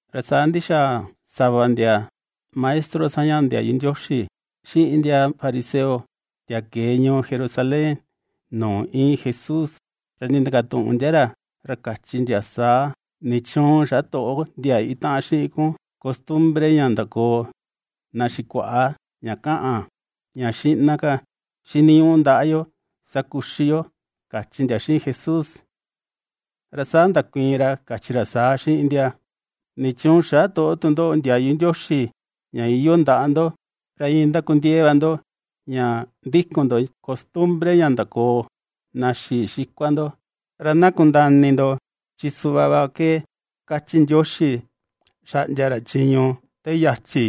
Ra saa ndixaa sava ndia maestro sañaꞌa ndiayu Ndioxi, xiꞌin ndia fariseo, ndia kee ñuu Jerusalén nuu íin Jesús, ra nindakatuꞌun ndia ra kachi ndia saa: ―¿Nichuun xä toꞌo ndia itaꞌan xiꞌin kun costumbre ña ndakoo na xikuaꞌa, ña kaꞌan, ña xiꞌna ka xiniñuꞌu ndaꞌa yo, ra saa kuxi yo? ―kachi ndia xiꞌin Jesús. Ra saa ndakuiin ra kachi ra saa xiꞌin ndia: ―¿Nichuun xä toꞌo tu ndoꞌo ndiayu Ndioxi ña iyoo ndaꞌa ndo, ra iin ndakundiee va ndo ña ndikun ndo costumbre ña ndakoo na xii xikua ndo? Ra na kundaa ini ndo, chi suꞌva va ke kachi Ndioxi xaꞌndia ra chiñu te yachi: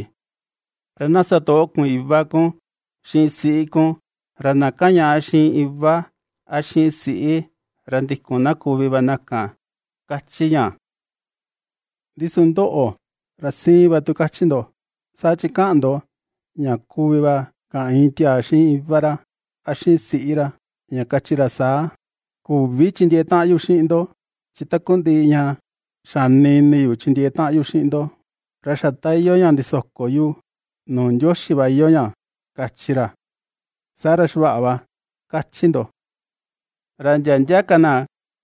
“Na sa toꞌo kun iva kun, xiꞌin siꞌi kun”, ra “Na kaꞌan ñàꞌa xiꞌin iva, a xiꞌin siꞌi, ra ^ndikun na kuvi va na kan”, ^kachi ña. Ndi su ndoꞌo ra siin va tu kachi ndo. Saa chi kaꞌan ndo ña kuvi va kaꞌan iin tiaa xiꞌin iva ra, a xiꞌin siꞌi ra, ña kachi ra saa: “Küvi chindiee taꞌan yu xiꞌin ndo, chi takundiꞌi ña xani ini yu chindiee taꞌan yu xiꞌin ndo, ra xa ta iyoo ña ndisoko yu nuu Ndioxi va iyoo ña”, kachi ra, saa ra xavaꞌa va, kachi ndo; ra ndia ndia ka na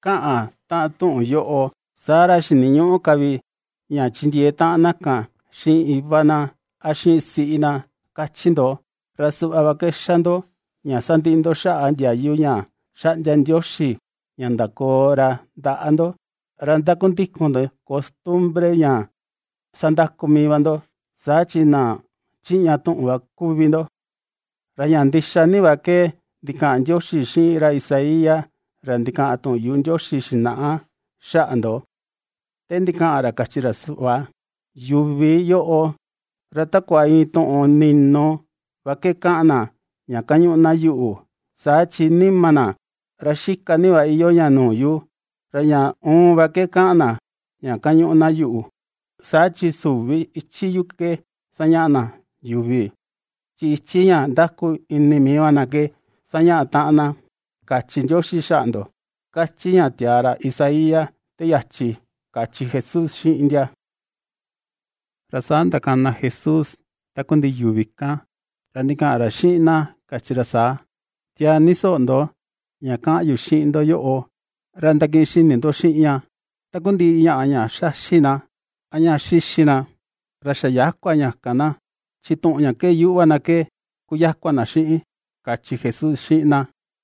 kaꞌan taꞌan tuꞌun yoꞌo, saa ra xiniñüꞌu ka vi ña chindiee taꞌan na kan xiꞌin iva na, a xiꞌin siꞌi na, kachi ndo. Ra suꞌva va ke xa ndo, ña sandiꞌi ndo xaꞌa ndiayu ña xaꞌndia Ndioxi ña ndakoo ra ndaꞌa ndo, ra ^ndakundikun ndo costumbre ña ^sandaku mii va ndo. Saa chi ¡na chiꞌña tuꞌun va kuvi ndoꞌo! Ra ña ndixa ni va ke ndikaꞌan Ndioxi xiꞌin ra Isaías ra ndikaꞌan tuꞌun yuꞌu ra xinaꞌa xaꞌa ndo, te ndikaꞌan ra, kachi ra suꞌva: Yuvi yoꞌo, ra takua iin tuꞌun ninu va ke kaꞌan na, ña kañuꞌu na yuꞌu, saa chi nima na, ra xika ni va iyoo ña nuu yu. Ra ña uun va ke kaꞌan na ña kañuꞌu na yuꞌu, saa chi süvi ichi yuꞌu ke sañaꞌa na yuvi, chi ichi ña ndaku ini mii va na ke sañaꞌa taꞌan na, kachi Ndioxi xaꞌa ndo, ^kachi ña tiaa ra Isaías te yachi ―kachi Jesús xiꞌin ndia. Ra saa ndakana Jesús takundiꞌi yuvi kan, ra ndikaꞌan ra xiꞌin na kachi ra saa: ―Tiaa ni soꞌo ndo ña kaꞌan yu xiꞌin ndo yoꞌo, ra ndakiꞌin xini ndo xiꞌin ña: Takundiꞌi ñaꞌa ña xaxi na, a ña xixi na, ra xa yäkua ña kan na, chi tuꞌun ña kee yuꞌu va na ke kuyakua na xiꞌin ―kachi Jesús xiꞌin na.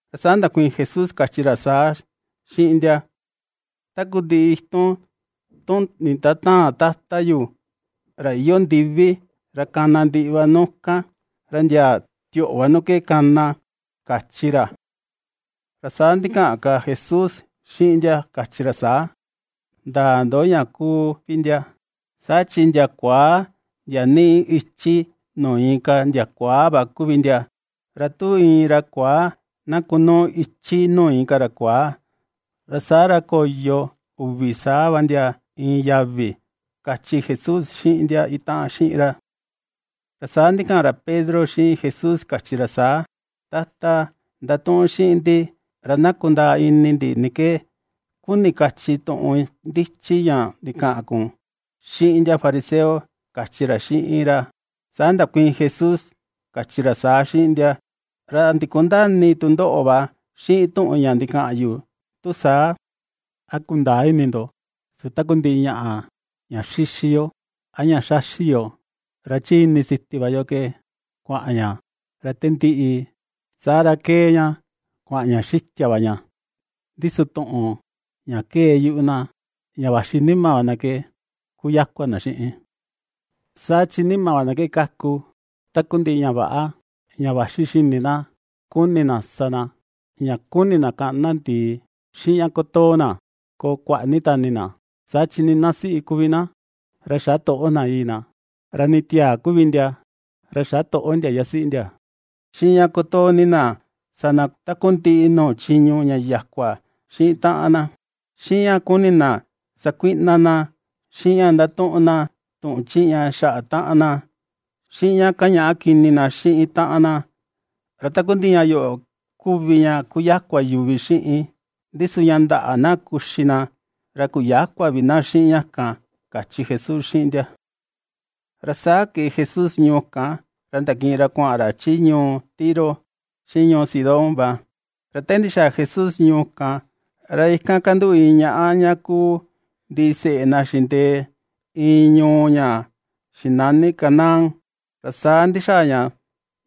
Ra saa ndakuiin Jesús kachi ra saa xiꞌin ndia: ―Takundiꞌi itun tu nindatäan Tata yu ra iyoo ndivi, ra kana ndiꞌi va nu kan, ra ndia tioꞌo va nu kee kana ―kachi ra. Ra saa ndikaꞌan ka Jesús xiꞌin ndia kachi ra saa: ―Ndäa ndo ña kuu vi ndia; saa chi na kuaa na niꞌi ichi nuu inka na kuaa va kuvi na, ra tu iin ra kuaa na kunuu ichi nuu inka ra kuaa, saa ra koyo uvi saa va ndia iin yavi ―kachi Jesús xiꞌin ndia itaꞌan xiꞌin ra. Ra saa ndikaꞌan ra Pedro xiꞌin Jesús kachi ra saa: ―Tata, ndatuꞌun xiꞌin ndi ra na kundaa ini ndi ni ke kuni kachi tuꞌun ndichi ña ndikaꞌan kun xiꞌin ndia fariseo ―kachi ra xiꞌin ra. Saa ndakuiin Jesús kachi ra saa xiꞌin ndia: ―¿Ra ndikundäa ini tu ndoꞌo va xiꞌin tuꞌun ña ndikaꞌan yu tu saa? ¿A kundäa ini ndo, su takundiꞌi ñaꞌa ña xixi yo, a ña xaxi yo, ra chi ini siti va yo ke kuaꞌan ña, ra te ndiꞌi, saa ra kee ña kuaꞌan ña xitia va ña? Ndi su tuꞌun ña kee yuꞌu na, ña vaxi nima va na ke, kuyakua na xiꞌin. Saa chi nima va na ke kaku takundiꞌi ña väꞌa, ña vaxi xini na kuni na sa na, ña kuni na kaꞌni na ndìì, xiꞌin ña kutoo na koo kuaꞌa ni tani na, saa chi nii na siꞌi kuvi na xä toꞌo na yii na, ra nii tiaa kuvi ndia, ra xä toꞌo ndia yasiꞌi ndia, xiꞌin ña kutoo ni na sa na takundiꞌi nuu chiñu yakua xiꞌin taꞌan na, xiꞌin ña kuni na sakuiꞌna na, xiꞌin ña ndatuꞌun na tuꞌun chiꞌña xaꞌa taꞌan na, xiꞌin ña kañaꞌa kini na xiꞌin taꞌan na, ra takundiꞌi ña yoꞌo kuvi ña kuyakua yuvi xiꞌin, ndi su ña ndäꞌa na kuxi na, ra kuyäkua vi na xiꞌin ña kan ―kachi Jesús xiꞌin ndia. Ra saa kee Jesús ñuu kan, ra ndakiꞌin ra kuaꞌan ra chi ñuu Tiro xiꞌin ñuu Sidón va. Ra te ndixaa Jesús ñuu kan, ra ikan kanduꞌu iin ñaꞌá ña kuu ndiseꞌe na xindee iin ñuu ña xinani Canaán, ra saa ndixaa ña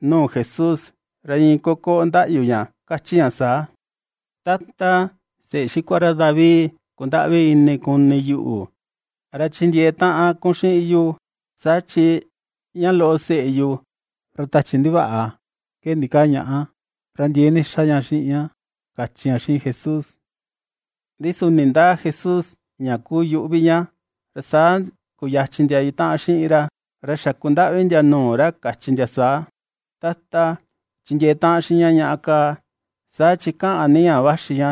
nuu Jesús, ra iin kokoꞌo ndaꞌyu ña kachi ña saa: ―¡Tata, Seꞌe xikua ra David, kundaꞌvi ini kuni yuꞌu ra chindiee taꞌan kun xiꞌin yu! Saa chi ña loꞌo seꞌe yu, ra tachi ndivaꞌa ke ndikaa ñaꞌa, ra ndiee ni xa ña xiꞌin ña ―kachi ña xiꞌin Jesús. Ndi su nindäa Jesús ña kuu yuꞌu vi ña. Ra saa kuyachin ndia itaꞌan xiꞌin ra, ra xakundaꞌvi ndia nuu ra kachi ndia saa: ―Tata, chindiee taꞌan xiꞌin ñaꞌa kaa, saa chi kaꞌan ni ña vaxi ña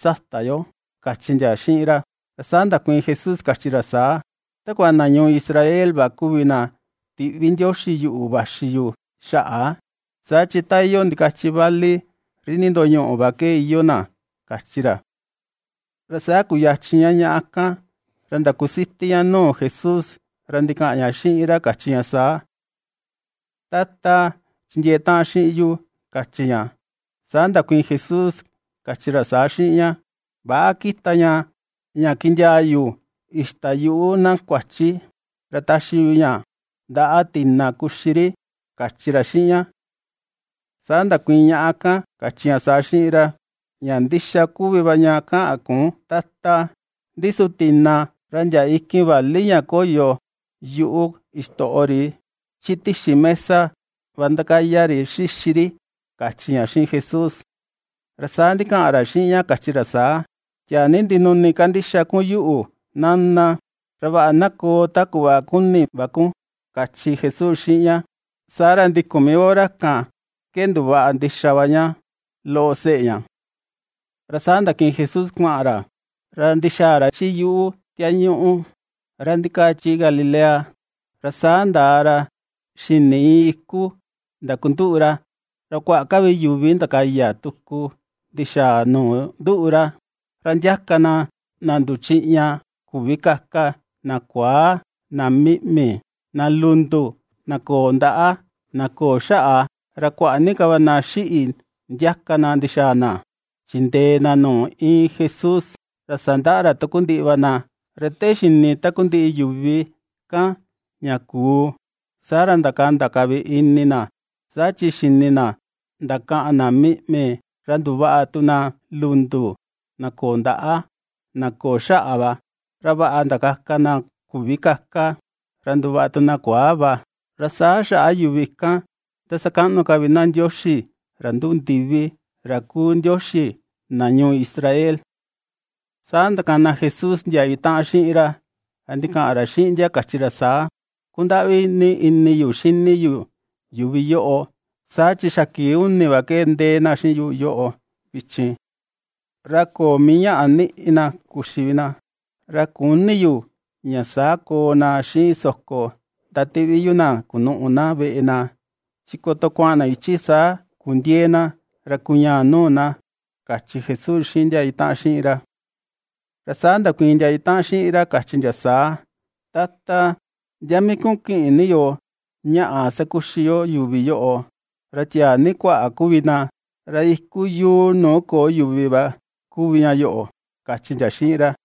sata yo ―kachi ndia xiꞌin ra. Ra saa ndakuiin Jesús kachi ra saa: ―Takua na ñuu Israel va kuvi na tiꞌvi Ndioxi yuꞌu vaxi yu xaꞌa, saa chi ta iyoo ndikachi vali ri nindoñuꞌu va ke iyoo na ―kachi ra. Ra saa kuyachin ñaꞌa kan, ra ndakusiti ña nuu Jesús, ra ndikaꞌan ña xiꞌin ra kachi ña saa: ―¡Tata, chindiee taꞌan xiꞌin yu! ―kachi ña. Saa ndakuiin Jesús kachi ra saa xiꞌin ña: ―Väꞌa kita ña, ña kindiaa yu ixta yuꞌu na kuachi, ra taxi yu ña ndaꞌa tina kuxi ri ―kachi ra xiꞌin ña. Saa ndakuiin ñaꞌa kan, kachi ña saa xiꞌin ra: ―Ña ndixa kuvi va ña kaꞌan kun, Tata, ndi su tina, ra ndia ikin vali ña koyo yuꞌu ixtoꞌo ri chi tixi mesa va ndakaya ri xixi ri ―kachi ña xiꞌin Jesús. Ra saa ndikaꞌan ra xiꞌin ña kachi ra saa: ―¡Tiaa ni ndinuni kandixa kun yuꞌu, Nana! Ra vaꞌa na koo ta kuꞌva kuni va kun ―kachi Jesús xiꞌin ña. Saa ra ndikun mii hora kan ke nduvaꞌa ndixa va ña loꞌo seꞌe ña. Ra saa ndakiꞌin Jesús kuaꞌan ra, ra ndixaa ra chi yuꞌu tiañuꞌu ra ndikaa chi Galilea, ra saa ndaa ra xini iin iku ndakunduꞌu ra. Ra kuaꞌa ka vi yuvi ndakaya tuku ndixaa nuu nduꞌu ra, ra ndiaka na, na nduchiꞌña küvi kaka, na kuaa, na miꞌmi, na lundu, na köo ndaꞌa, na köo xaꞌa, ra kuaꞌa ni ka va na xíꞌi̱ ndiaka na ndixaa na, chindee na nuu íin Jesús, ra sandaꞌa ra takundiꞌi va na. Ra te xini takundiꞌi yuvi kan ña kuu, saa ra ndakanda ka vi ini na, saa chi xini na, ndakaꞌan na miꞌmi, ra nduvaꞌa tu na lundu: na köo ndaꞌa, na köo xaꞌa va, ra vaꞌa ndakaka na küvi kaka, ra nduvaꞌa tu nuu na kuaa va. Ra saa xaꞌa yuvi kan ^ndasakaꞌnu ka vi na Ndioxi, ra nduꞌu ndivi, ra kuu Ndioxi na ñuu Israel. Saa ndakana Jesús ndia itaꞌan xiꞌin ra, ra ndikaꞌan ra xiꞌin ndia kachi ra saa: ―Kundaꞌvi ni ini yu xini yu yuvi yoꞌo, saa chi xa kii uni va ke ndee na xiꞌin yu yoꞌo vichin, ra köo mii ñaꞌa niꞌi na kuxi vi na. Ra küni yu ña saa koo na xiꞌin soko ndatiꞌvi yu na kunuꞌu na veꞌe na, chi koto kuaꞌan na ichi saa kundiëe na, ra kuñaa nuu na ―kachi Jesús xiꞌin ndia itaꞌan xiꞌin ra. Ra saa ndakuiin ndia itaꞌan xiꞌin ra kachi ndia saa: ―Tata, ¿ndia mii kuꞌun kiꞌin ni yo ñaꞌa sakuxi yo yuvi yoꞌo, ra tiaa ni kuaꞌa kuvi na? Ra iku yuu nuu köo yuvi va kuvi ña yoꞌo ―kachi ndia xiꞌin ra.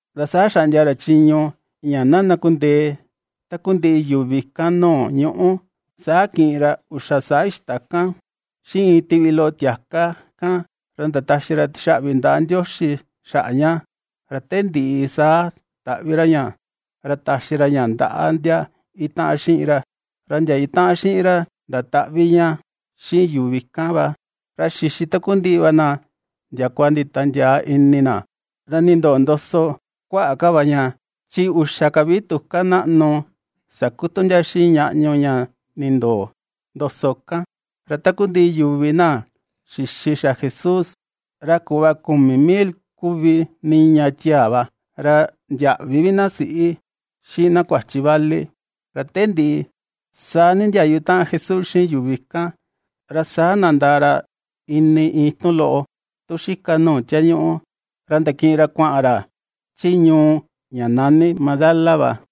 Ra saa xaꞌndia ra chiñu, ña na ndakundee takundiꞌi yuvi kan, nuu ñuꞌú, Saa kiꞌin ra uxa saa ixta kan, xiꞌin iin tiꞌvi loꞌo tiaka kan, ra ndataxi ra tixaꞌvi ndaꞌa Ndioxi xaꞌa ña, ra te ndiꞌi saa taꞌvi ra ña, ra taxi ra ña ndaꞌa ndia itaꞌan xiꞌin ra, ra ndia itaꞌan xiꞌin ra ndataꞌvi ña xiꞌin yuvi kan va. Ra xixi takundiꞌi va na ndiakua nditiandiaa ini na. Ra nindoo ndoso kuaꞌa ka va ña, chi uxa ka vi tuká naꞌnu sakutu ndia xiꞌin ñaꞌñu ña nindoo ndoso kan. Ra takundiꞌi yuvi na xixi xa Jesús, ra kuꞌva kumi mil kuvi niña tiaa va, ra ndiäꞌvi vi na siꞌi, xiꞌin na kuachi vali. Ra te ndiꞌi, saa nindiayu taꞌan Jesús xiꞌin yuvi kan, ra saa nandaa ra ini iin itun loꞌo tu xika nuu tiañuꞌu, ra ndakiꞌin ra kuaꞌan ra chi ñuu ña nani Magdala va.